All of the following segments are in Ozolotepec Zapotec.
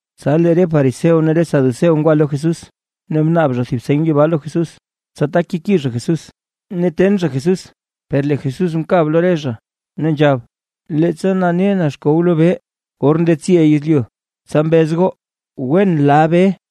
Tsa lee re fariseo ne re saduceo ngwa lo Jesús; ne mnaab zha thib seny yibaa lo Jesús, tsa tak keki zha Jesús ne ten zha Jesús. Per lee Jesús mkab lo re zha ne nzhab: ―Leettsa nane na xkow lobee or ndetsi yezlyu; tsa mbez goo: “Wen la bee”.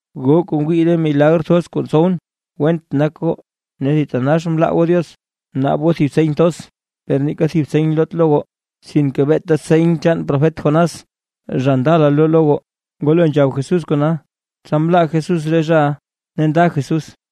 Goo kuu ngwii re milagr thoz kuu ntsowʼn, went nak goo ne thitanax mlaa goo Diox. Naab goo thib seny thoz, per neeka thib seny loot lo goo, sinke beeta seny chaan profet Jonás zha ndala loo lo goo. Ngwalo nzhab Jesús kona, tsa mlaa Jesús re zhaʼa ne nda Jesús.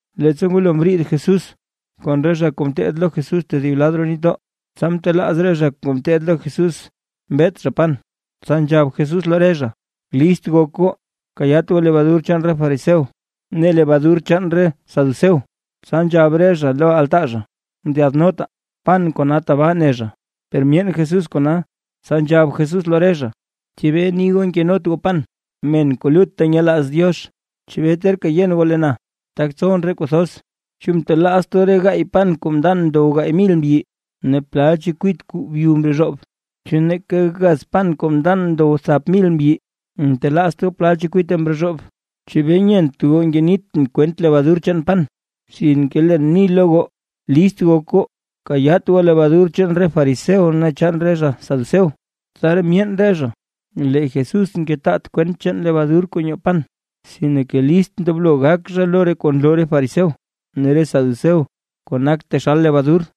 Leettsa ngwalo mriid Jesús kon re zha kuu ngeteed lo Jesús tedib lad roo nitdoo, tsa mtelaaz re zha kuu ngeteed lo Jesús mbet zha pan. Tsa nzhab Jesús lo re zha: ―List gok goo, kayaat goo lebadur chaan re fariseo ne lebadur chaan re saduceo. Tsa nzhab re zha lo altaa zha: ―Ndyaadnotaa; pan kona tabaa ne zha. Per myeen Jesús kona, tsa nzhab Jesús lo re zha: ―¿Chebee ni goo nkenot goo pan? ¡Men kuu lutta nyelaaz Diox! ¿Chebee terka yen goo lee na, tak ntsowʼn re kuu thoz? ¿Chu ntelaazt goo re gaay pan kuu mndan ndow gaay mil mbyi? Ne, ¿plal chekwit kuu byu mrozhoob? ¿Chu neeka gaz pan kuu mndan ndow thap mil mbyi, ntelaazt goo plal chekwite mrozhoob? ¿Chebee nyeent goo ngenitʼn kwent lebadur chaan pan? Sinke leen ni lo goo list gok goo, kayaat goo lebadur chaan re fariseo ne chaan re zha saduceo. Tsaraa myeen re zha, lee Jesús ngetaat kwent chaan lebadur kuu nyoo pan, sinke list ndoblo gak zha lo re kuu nloo re fariseo ne re saduceo, kuu nak taxal lebadur.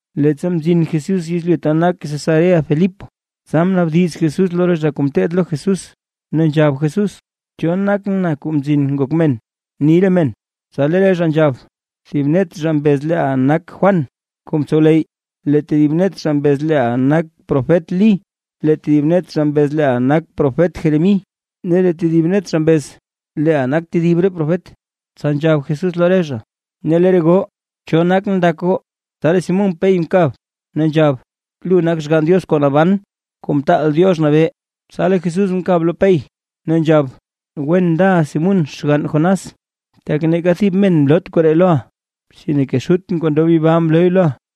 Leettsa mzin Jesús yezlyu ta nak Cesarea-Filipo, tsa mnaabdiz Jesús lo re zha kuu ngeteed lo Jesús, ne nzhab Jesús: ―¿Cho nak na Kuu Mzin Ngok Men, ni re men? Tsa lee re zha nzhab: ―Thib net zha mbez leeʼa nak Juan kuu mtsowleyy, lee tedib net zha mbez leeʼa nak profet Lí, lee tedib net zha mbez leeʼa nak profet Jeremí, ne lee tedib net zha mbez leeʼa nak tedib re profet. Tsa nzhab Jesús lo re zha: ―Ne lee re goo, ¿cho nakʼn ndak goo? Tsa lee Simún Pey mkab, ne nzhab: ―Lu nak Xgann Diox kuu naban, Kuu Mtaal Diox Nabee. Tsa lee Jesús mkab lo Pey, ne nzhab: ―Wen ndaʼa Simún xgann Jonás. Tak neeka thib men mloot koree loʼa, sinke Xutʼn kuu ndob yibaa mlooy loʼa.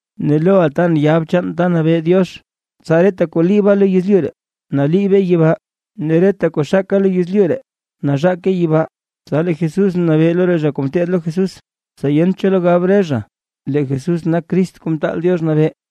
Ne loʼa tan yab chaan ta nabee Diox. Tsa reta kuu liiba lo yezlyu ree, naliibe yibaa, ne reta kuu xaka lo yezlyu ree, nazhake yibaa. Tsa lee Jesús mnabee lo re zha kuu ngeteed lo Jesús, tsa yent cho lo gab re zha, lee Jesús nak Crist Kuu Mtaal Diox Nabee.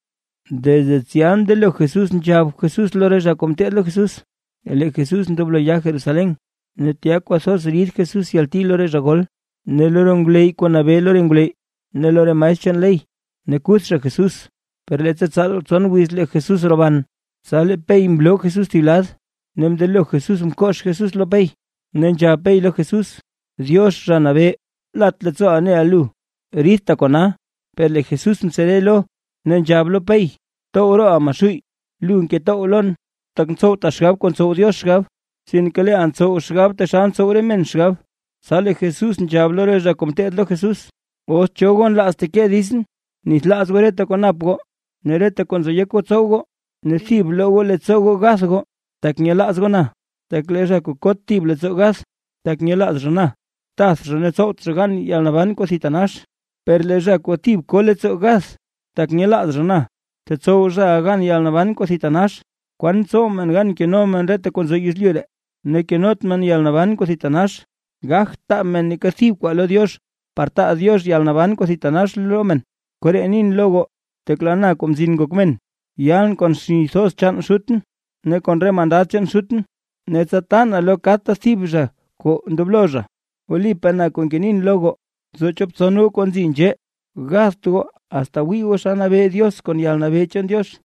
Desde tsya mndelo Jesús nzhab Jesús lo re zha kuu ngeteed lo Jesús, lee Jesús ndoblo ya Jerusalén, ne tya kwathoz rid Jesús yalti lo re zha gol, ne lo re ngwleyy kuu nabee lo re ngwleyy ne lo re maestr chaan ley. Ne kuth zha Jesús, per leettsa tsaal tson wiz lee Jesús roban. Tsa lee Pey mloo Jesús thib lad, ne mndelo Jesús mkox Jesús lo Pey, ne nzhab Pey lo Jesús: ―Diox, Zha Nabee, lat leettsoo neʼa. ¡Ridta kona! Per lee Jesús mtsere lo, ne nzhab lo Pey: ―¡Btow rooʼa Maxuuy! Lu ngetow lon. Tak ntsowta xgab kuu ntsow Diox xgab; sinke leeʼa ntsow xgab taxal ntsow re men xgab. Tsa lee Jesús nzhab lo re zha kuu ngeteed lo Jesús: ―Os cho goo nlaaz teke ditsʼn, bnithlaaz goo reta kuu nap goo, ne reta kuu nzo yek goo tsow goo, ne thib bloo goo leettsoo goo gath goo, tak nyelaaz goo na. Tak lee zha kuu kot thib leettsoo gath, tak nyelaaz zha na, tath zhaʼa ne tsowt zha gan yalnaban kuu thitanax; per lee zha kuu thib ko leettsoo gath tak nyelaaz na, tetsow zhaʼa gan yalnaban kuu thitanax. ¿Kwan tsow men gan keno zha reta kuu nzo yezlyu ree, ne kenot zha yalnaban kuu thitanax? Gagt taa men neeka thib kwaa lo Diox par taa Diox yalnaban kuu thitanax lo men. Koree nin lo goo, tak lee na Kuu Mzin Ngok Men, yaalʼn kon xni thoz chaan Xutʼn ne kon re mandad Xutʼn, ne tsa taa na lo kadta thib thib zha kuu ndoblo zha. Wlipaa na kuu ngenin lo goo, nzo chop tson goo kuu nzi nzhee, gatht goo, asta wii goo naa xa nabee Diox kon yalnabee chaan Diox.